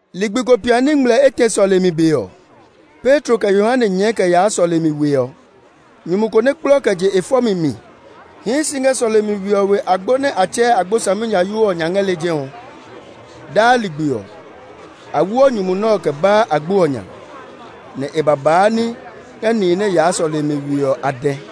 Ligbi ko piani ngmlɛ etɛ sɔlemi be ɔ, Petro kɛ Yohane nyɛɛ kɛ yaa sɔlemi we ɔ. Nyumu ko nɛ kplɔ kɛ je e fɔmi mi hii si ngɛ sɔlemi we ɔ we agbo nɛ a tsɛɛ Agbo Saminyayoo ɔ nya ngɛ lejɛ ɔ. Daa ligbi ɔ, a woɔ nyumu nɛ ɔ kɛ baa agbo ɔ nya, nɛ e ba baa ní ngɛ nihi nɛ yaa sɔlemi we ɔ a dɛ.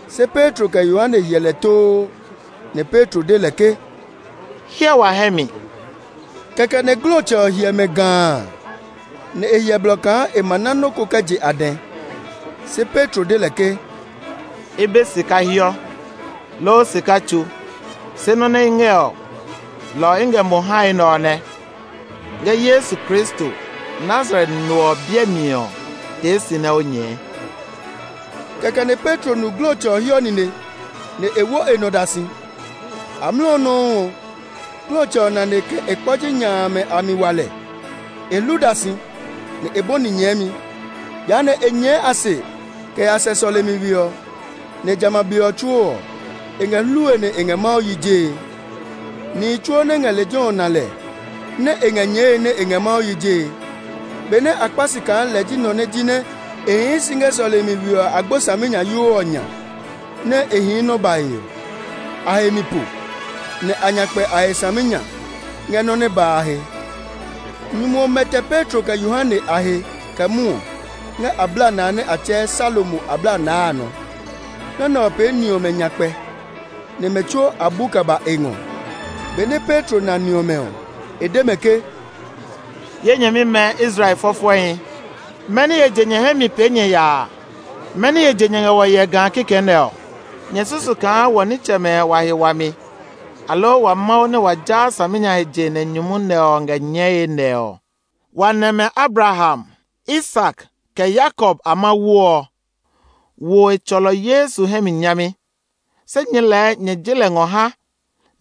Se Petro kɛ Yohane hyɛ lɛ too; nɛ Petro de lɛ ke, “Hyɛ wa hɛ mi!” Kɛkɛ nɛ glɔtsɛ ɔ hyɛ mɛ gaa, nɛ e hyɛ blɔ kaa e ma ná nɔ́ ko kɛ je a dɛ. Se Petro de lɛ ke, “I be sika hiɔ, loo sika tsu, se nɔ́ nɛ i ngɛ ɔ, lɔ ɔ i ngɛ mo hae nɛ ɔ nɛ. Ngɛ Yesu Kristo, Nazaret no ɔ biɛ mi ɔ, tee si nɛ o nyɛɛ!” Kɛkɛ nɛ Petro nu glɔtsɛ ɔ hiɔ nine, nɛ e wo e nɔ da si. Amlɔ ɔ nɔuu ɔ, glɔtsɛ ɔ nane kɛ e kpɔji nya amɛ a mi wa lɛ; e hlu da si, nɛ e bɔni nyɛɛmi. Jehanɛ e nyɛɛ a se kɛ ya sɛ sɔlemi we ɔ, nɛ jamɛ a be ɔ tsuo ɔ, e ngɛ hlue nɛ e ngɛ Mawu yi jee. Nihi tsuo nɛ ngɛ lejɛ ɔ na lɛ nɛ e ngɛ nyɛɛe nɛ e ngɛ Mawu yi jee. Benɛ a kpá si kaa lɛ ji nɔ nɛ jinɛ e hii si ngɛ sɔlemi we ɔ Agbo Saminyayoo ɔ nya, nɛ e hii nɔ́ bae ɔ, a he mi po, nɛ a nya kpɛ a he saminya ngɛ nɔ́ nɛ ba a he. Nyumu ɔ mɛtɛ Petro kɛ Yohane a he kɛ mwɔɔ ngɛ ablanaa nɛ a tsɛɛ Salomo Ablanaa a nɔ. Nɔ́ nɛ ɔ pee ni ɔmɛ nyakpɛ, nɛ mɛ tsuo a bu kɛ ba e ngɔ. Benɛ Petro na ni ɔmɛ ɔ, e de mɛ ke, “Ye nyɛmimɛ Israel fɔfɔɛhi, mɛni he je nyɛ hɛ mi pee nyɛ yaa? Mɛni he je nyɛ ngɛ wɔ hyɛe gaa kikɛ nɛ ɔ? Nyɛ susu kaa wɔ nitsɛmɛ wa he wami, aloo wa Mawu nɛ wa jaa saminya he je nɛ nyumu nɛ ɔ ngɛ nyɛɛe nɛ ɔ? Wa nɛmɛ Abraham, Isak, kɛ Yakob a Mawu ɔ wo e tsɔlɔ Yesu hɛ mi nyami. Se nyɛɛ lɛɛ nyɛ je lɛ ngɔ ha,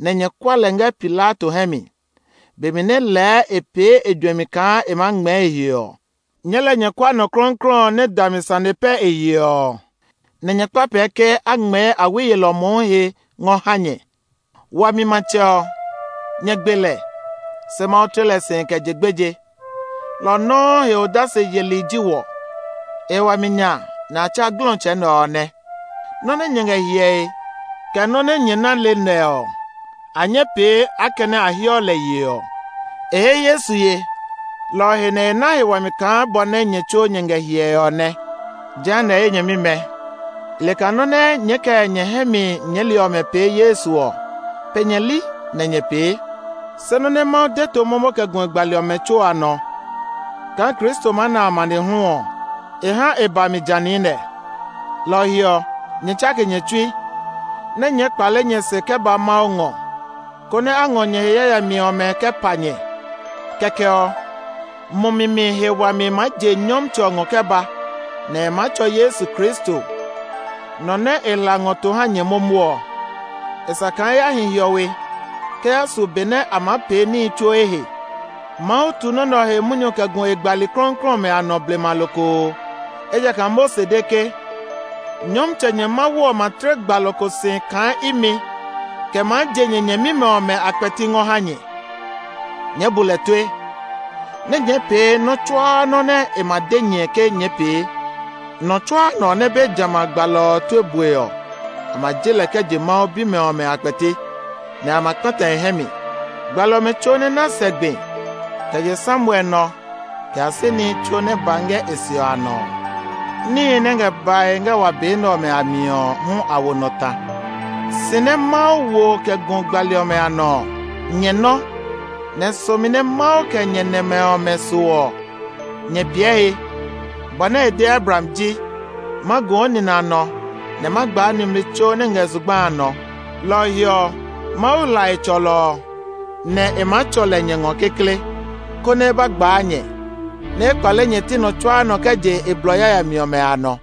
nɛ nyɛ kua lɛ ngɛ Pilato hɛ mi, be mi nɛ lɛɛ e pee e juɛmi kaa e maa ngmɛɛ e he ɔ. Nyɛɛ lɛɛ nyɛ kua nɔ klɔuklɔu ɔ nɛ dami sane pɛ e yeɔ ɔ, nɛ nyɛ kpa pɛɛ ke a ngmɛɛ awi yelɔ mohu he ngɔ ha nyɛ. Wami matsɛ ɔ, nyɛ gbe lɛ. Se Mawu tle lɛ si kɛ je gbeje; lɔ ɔ nɔuu he odase yeli ji wɔ. E he wami nya nɛ a tsa glɔtsɛ nɛ ɔ nɛ. Nɔ́ nɛ nyɛ ngɛ hyɛe, kɛ nɔ́ nɛ nyɛ ná le nɛ ɔ, a nyɛ́ pee akɛnɛ a heɔ lɛ yeɔ. E he Yesu ye, lɔ ɔ he nɛ e na he wami kaa bɔ nɛ nyɛ tsuo nyɛ ngɛ hyɛe ɔ nɛ. “Jehanɛ ye nyɛmimɛ, i le kaa nɔ́ nɛ nyɛɛ kɛ nyɛ hɛ mi nyɛɛli ɔmɛ pee Yesu ɔ, pe nyɛ li nɛ nyɛ pee. Se nɔ́ nɛ Mawu de to momo kɛ gu e gbali ɔmɛ tsuo a nɔ kaa Kristo maa na amanehlu ɔ, ha e ba mi ja niinɛ. Lɔ ɔ he ɔ, nyɛ tsake nyɛ tsui, nɛ nyɛɛ kpale nyɛ se kɛ ba Mawu ngɔ, konɛ a ngɔ nyɛ he yayami ɔmɛ kɛ pa nyɛ. Kɛkɛ ɔ, mumi mi he wami maa je Nyɔmtsɛ ɔ ngɔ kɛ ba; e maa tsɔ Yesu Kristo, nɔ nɛ e hla ngɔ to ha nyɛ momo ɔ. E sa kaa e ya hi hiɔwe kɛ yaa su be nɛ a maa pee níhi tsuo ehe. Mawu tu nɔ́ nɛ ɔ he munyu kɛ gu e gbali klɔuklɔu ɔmɛ a nɔ blema lokoo. Ejakaa Mose de ke, ‘Nyɔmtsɛ nyɛ Mawu ɔ ma tle gbalɔ ko si kaa imi kɛ maa je nyɛ nyɛmimɛ ɔmɛ a kpɛti ngɔ ha nyɛ. Nyɛɛ bu lɛ tue, nɛ nyɛɛ pee nɔ́ tsuaa nɔ́ nɛ e ma de nyɛ ke nyɛɛ pee. Nɔ tsuaa nɔ nɛ be jamɛ a gbalɔ ɔ tue bue ɔ, a ma je lɛ kɛ je Mawu bimɛ ɔmɛ a kpɛti, nɛ a ma kpata e hɛ mi.’ Gbali ɔmɛ tsuo nɛ ná sɛ gbi, kɛ je Samuel nɔ kɛ ya si nihi tsuo nɛ ba ngɛ e se ɔ a nɔ ɔ, níhi nɛ ngɛ bae ngɛ wa be nɛ ɔmɛ a mi ɔ hu a wo nɔ ta. Si nɛ Mawu wo kɛ gu gbali ɔmɛ a nɔ ɔ, nyɛ nɔ́, nɛ somi nɛ Mawu kɛ nyɛ nɛmɛ ɔmɛ so ɔ, nyɛ piɛ he. Bɔ nɛ e de Abraham ji, ‘Ma gu o nina nɔ nɛ ma gbaa nimli tsuo ngɛ zugba a nɔ.’ Lɔ ɔ he ɔ, Mawu hla e tsɔlɔ ɔ, nɛ e maa tsɔ lɛ nyɛ ngɔ kekle, konɛ e ba gbaa nyɛ, nɛ e kpale nyɛ ti nɔ tsuaa nɔ kɛ je e blɔ yayami ɔmɛ a nɔ.”